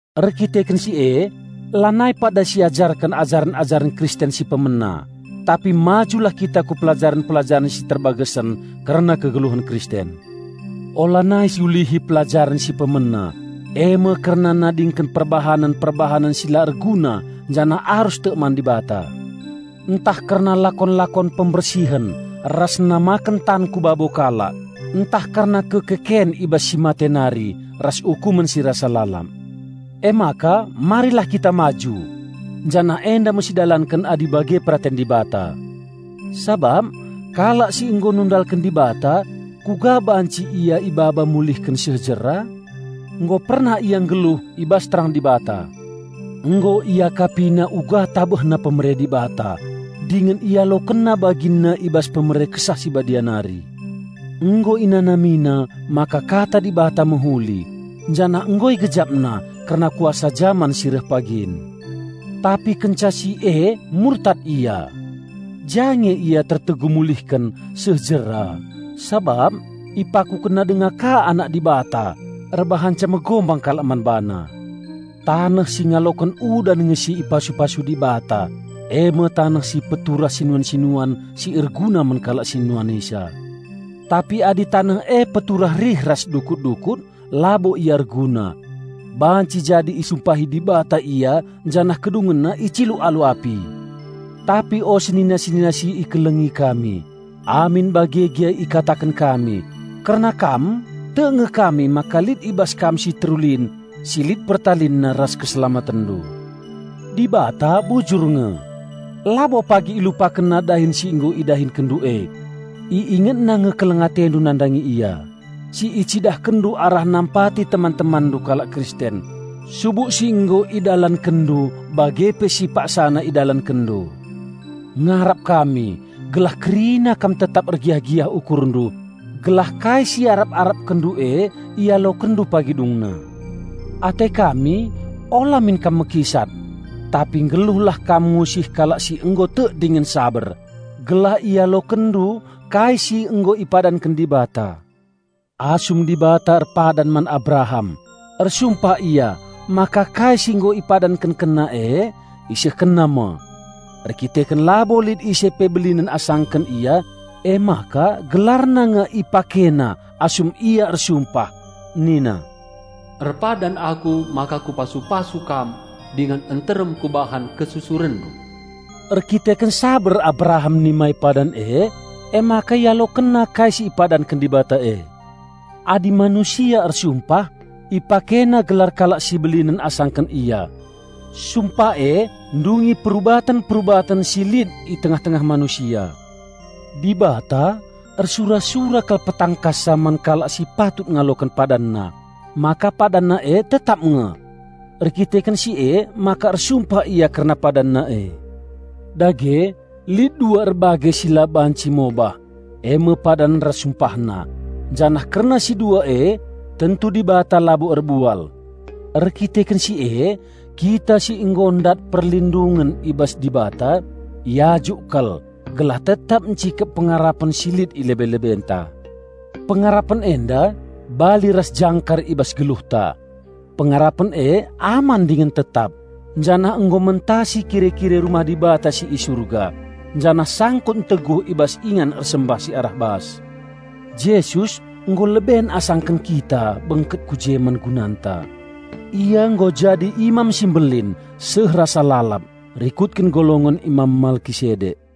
Erkiteken si e lanai pada siajarken ajaren-ajaren Kristen si pemena, tapi majulah kita ku pelajaren-pelajaren si terbagesen kerna kegeluhen Kristen. Ulanai siulihi pelajaren si pemena, e me kerna nadingken perbahanen-perbahanen si la erguna janah arus tek man Dibata; ntah kerna lakon-lakon pembersihen ras namaken tan ku babo kalak, ntah kerna kekeken i bas si mate nari ras ukumen si rasa lalap. Emaka marilah kita maju! Janah enda me sidalanken adi bage peraten Dibata! Sabap kalak si nggo nundalken Dibata kuga banci ia ibaba mulihken seh jera? Nggo pernah ia nggeluh i bas terang Dibata. Nggo iakapina uga tabehna pemere Dibata, dingen ialokenna baginna i bas pemere Kesah Si Badia nari. Nggo inanamina maka Kata Dibata mehuli, janah nggo igejapna kerna kuasa jaman si reh pagin. Tapi kenca si e murtad ia! Ja nge ia tertegu mulihken seh jera sabap ipakukenna denga ka Anak Dibata erbahanca megombang kalak man BaNa. Taneh si ngaloken udan nge si ipasu-pasu Dibata, e me taneh si peturah sinuan-sinuan si erguna man kalak si nuanisa. Tapi adi taneh e peturah rih ras dukut-dukut, labo ia erguna; banci jadi isumpahi Dibata ia janah kedungenna iciluk alu api. Tapi o senina-senina si ikelengi kami, amin bage gia ikataken kami, kerna kam tek nge kami maka lit i bas kam si terulin si lit pertalinna ras keselamatenndu. Dibata bujur nge. Labo pagi IlupakenNa dahin si nggo idahikenndu e. IingetNa nge keleng atendu nandangi Ia, si icidahkenndu arah nampati teman-temanndu kalak Kristen, subuk si nggo idalankenndu bage pe si paksana idalankenndu. Ngarap kami gelah kerina kam tetap ergiah-giah ukurndu, gelah kai si iarap-arapkenndu e ialokenndu pagi dungna. Ate kami ula min kam mekisat. Tapi nggeluhlah kam ngusih kalak si nggo tek dingen saber, gelah ialokenndu kai si nggo ipadanken Dibata. Asum Dibata erpadan man Abraham, ersumpah Ia maka kai si nggo IpadankenkenNa e IsehkenNa me. Erdandanken labo lit ise pe belinen asangken Ia, emaka GelarNa nge IpakeNa asum Ia ersumpah. Nina, "Erpadan Aku maka Kupasu-pasu kam dingen nterem Kubahan kesusurenndu." Erdandanken saber Abraham nimai padan e, emaka ialokenna kai si ipadanken Dibata e. Adi manusia ersumpah, ipakena gelar kalak si belinen asangken ia. Sumpah e ndungi perubaten-perubaten si lit i tengah-tengah manusia. Dibata ersura-sura kal petangkassa man kalak si patut ngaloken PadaanNa, maka PadanNa e tetap nge. Erdandanken si emaka ersumpah Ia kerna PadanNa e. Dage lit dua erbage si la banci mobah, e me padan ras SumpahNa, janah kerna si dua e tentu Dibata labo erbual. Erkiteken si e kita si nggo ndat perlindungen i bas Dibata, iajuk kal gelah tetap ncikep pengarapen si lit i lebe-lebenta. Pengarapen enda bali ras jangkar i bas geluhta. Pengarapen e aman dingen tetap, janah nggo mentasi kire-kire rumah Dibata si i Surga, janah sangkut nteguh i bas ingan ersembah si arah bas. Jesus nggo leben asaken kita bengket ku je man gunanta. Ia nggo jadi Imam si Mbelin seh rasa lalap rikutken golongen Imam Malkisedek.